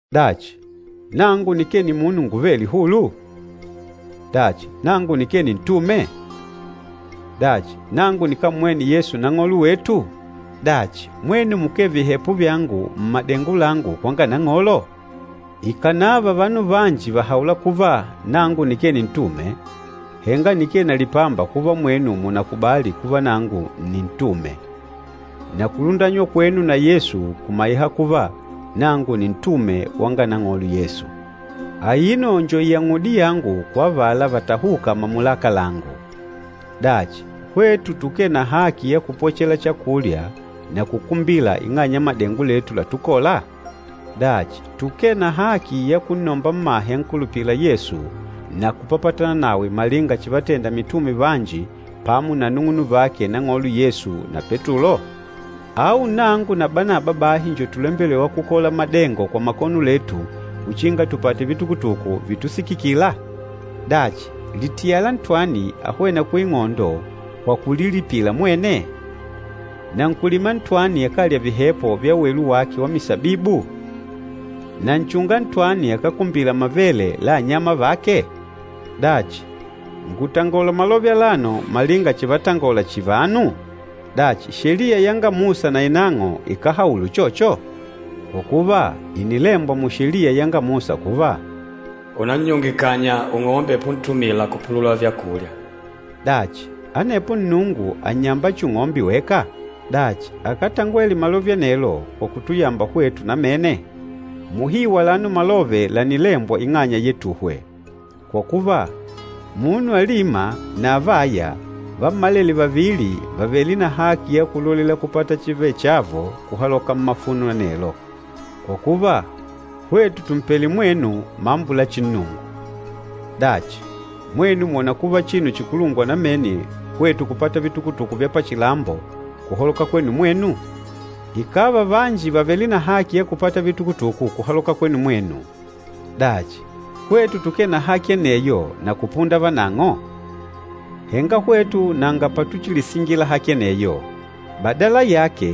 Dachi, nangu nikee nimunu nguvêle hulu? Dachi, nangu nikee nintume? Dachi, nangu nikámmwene Yesu Nang'olo wetu? Dachi, mwenu mukee vihepo vyangu mmadengo langu kwanga Nang'olo? Ikànava vanu vanji vàhaula kuva nangu nikee nintume, henga nikee na lipamba kuva mwenu mùnakubali kuva nangu nni ntume. Na kulundanywa kwenu na Yesu kumaiha kuva nangu nintume wanga Nang'olo Yesu. Aino njo iyang'udi yangu kwa avala vatahûka mamulaka langu. Dachi, hwetu tukee na haki ya kupwechela chakulya na kukumbila ing'anya ya madengo letu latukola? Dachi, tukee na haki ya kunnomba mmahe ankulupîla Yesu na kupapatana nawe malinga chivatenda mitume vanji pamo na anung'unuvake Nang'olo Yesu na Petulo? Au nangu na Banaba bahi njo tulembelêwa kukola madengo kwa makono letu uchinga tupate vitukutuku vitusikikila? Dachi, litiyala ntwani ahwêna kuing'ondo kwa kulilipila mwene? Na nkúlima ntwani akálya vihepo vya welu wake wa misabibu? Na nchunga ntwani akákumbila mavele la anyama vake? Dachi, ngùtangola malove alano malinga chivatangola chihi vanu? Dachi, Sheliya yanga Musa nainang'o ikáhaula uchocho? Kwa kuva, ìnilembwa mu Sheliya yanga Musa kuva, “Unannyunge kanya ung'ombe puntumila kupulula vyakulya.” Dachi, anepo Nnungu ànnyamba chihi ung'ombe weka? Dachi, akátangwele malove anelo kwa kutuyamba hwetu namene? Muhiu alano malove lànilembwa ing'anya yetuhwe. Kwa kuva, munu alîma na avâya, vammalele vavili vàvele na haki ya kulolela kupata chivechavo kuhaloka mmafuno anelo. Kwa kuva, hwetu tùmpele mwenu mambo la chinnungu, dachi mwenu mwòna kuva chinu chikulungwa namene hwetu kupata vitukutuku vya pachilambo kuhaloka kwenu mwenu? Ikàva vanji vàvele na haki ya kupata vitukutuku kuhaloka kwenu mwenu, dachi, hwetu tukee na haki aneyo na kupunda vanang'o? Henga hwetu nanga patuchilisingila haki aneyo. Badala yake,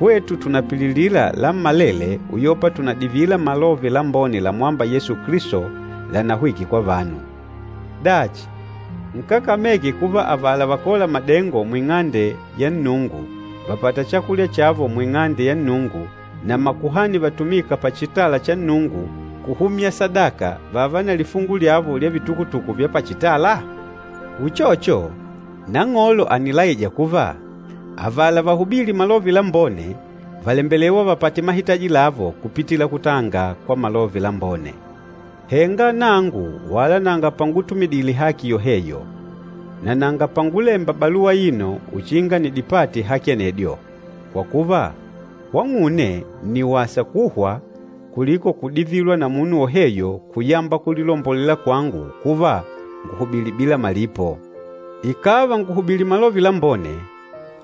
hwetu tùnapililila lammalele uyopa tùnadivila Malove Lambone lamwâmba Yesu Kilisto lànahwike kwa vanu. Dachi, nkákameke kuva avala vakôla madengo mu Ing'ande ya Nnungu vàpata chakulya chavo mu Ing'ande ya Nnungu, na makuhani vatumîka pachitala cha Nnungu kuhumya sadaka vààva na lifungu lyavo lya vitukutuku vya pachitala? Uchocho, Nang'olo ànilaija kuva avala vahubîli Malove Lambone vàlembelewa vapate mahitaji lavo kupitila kutanga kwa Malove Lambone. Henga nangu wala nanga pangutumidile haki yoheyo, na nanga pangulemba baluwa aino uchinga nidipate haki anedyo. Kwa kuva, kwang'une nni wasa kuhwa kuliko kudivilwa na munu woheyo kuyamba kulilombolela kwangu kuva, nguhubili bila malipo. Ikàva ngùlahubili Malove Lambone,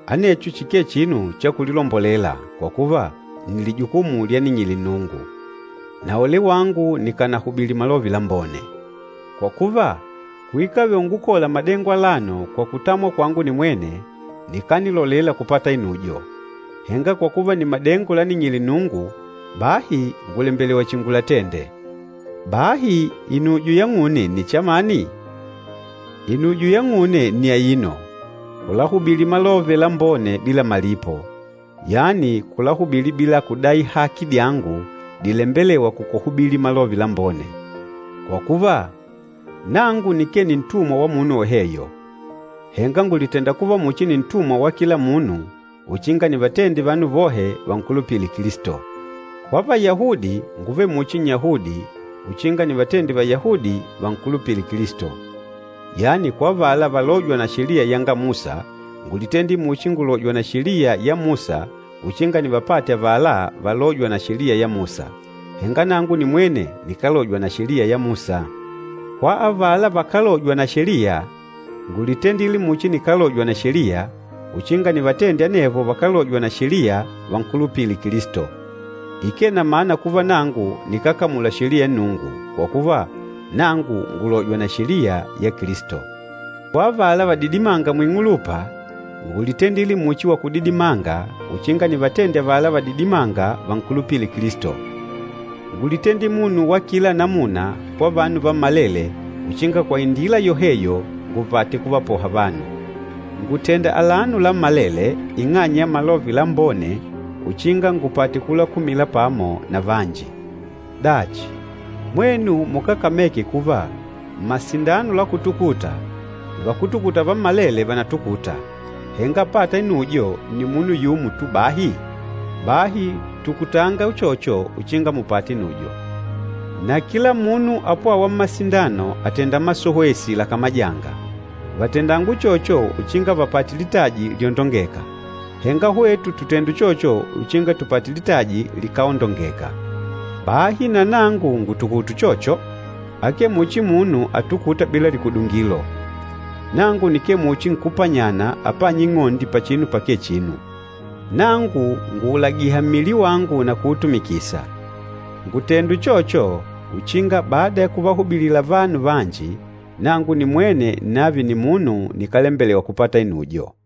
anecho chikee chinu cha kulilombolela, kwa kuva, nni lijukumu lyaning'ile Nnungu. Na ole wangu nikánalahubili Malove Lambone! Kwa kuva, kuikave ungukola madengo alano kwa kutamwa kwangu nimwene, nikanilolela kupata inujo. Henga kwa kuva nni madengo laning'ile Nnungu, bahi ngùlembelewa chihi ngulatende. Bahi inujo yang'une nni chamani? Inujo yang'une nni aino, kulahubili Malove Lambone bila malipo, yani kulahubili bila kudai haki dyangu dilembelêwa kwa kuhubili Malove Lambone. Kwa kuva, nangu nikee nintumwa wa munu woheyo, henga ngùlitenda kuva muchi nintumwa wa kila munu uchinga nivatende vanu vohe vankulupile Kilisto. Kwa Vayahudi, ngúvele muchi Nnyahudi, uchinga nivatende Vayahudi vankulupile Kilisto. Yani kwa avala valôjwa na Sheliya yanga Musa, ngúlitendile muchi ngùlojwa na Sheliya ya Musa uchinga nivapate avala valôjwa na Sheliya ya Musa. Henga nangu nimwene nikálojwa na Sheliya ya Musa. Kwa avala vakálojwa na Sheliya, ngúlitendile muchi nikálojwa na Sheliya, uchinga nivatende anevo vakálojwa na Sheliya vankulupile Kilisto. Ikee na mana kuva nangu nikákamula Sheliya ya Nnungu, kwa kuva, nangu ngùlojwa na Sheliya ya Kilisto. Kwa avala vadidimânga muing'ulupa ngúlitendile muchi wakudidimanga uchinga nivatende avala vadidimânga vankulupile Kilisto. Ngúlitendile munu wa kila namuna kwa vanu vammalele uchinga kwa indila yoheyo ngupate kuvapoha vanu. Ngùtenda alano lammalele ing'anya ya Malove Lambone uchinga ngupate kulakumila pamo na vanji. Dachi, mwenu mukákameke kuva mmasindano la kutukuta, vakútukuta vammalele vànatukuta, henga apâta inujo nni munu yumo tu bahi? Bahi tukutanga uchocho uchinga mupate inujo. Na kila munu apwâwa mmasindano àtenda masowesi lakamajanga, vàtendanga uchocho uchinga vapate litaji lyondongeka! Henga hwetu tùtenda uchocho uchinga tupate litaji likáondongeka. Bahi na nangu ngùtukuta uchocho, akee muchi munu atukûta bila likudungilo. Nangu nikee muchi nkúpanyana apânya ing'ondi pachinu pakee chinu. Nangu ngùulagiha mmili wangu na kuutumikisa. Ngùtenda uchocho uchinga bada ya kuvahubilila vanu vanji, nangu nimwene nnave nimunu nikálembelewa kupata inujo.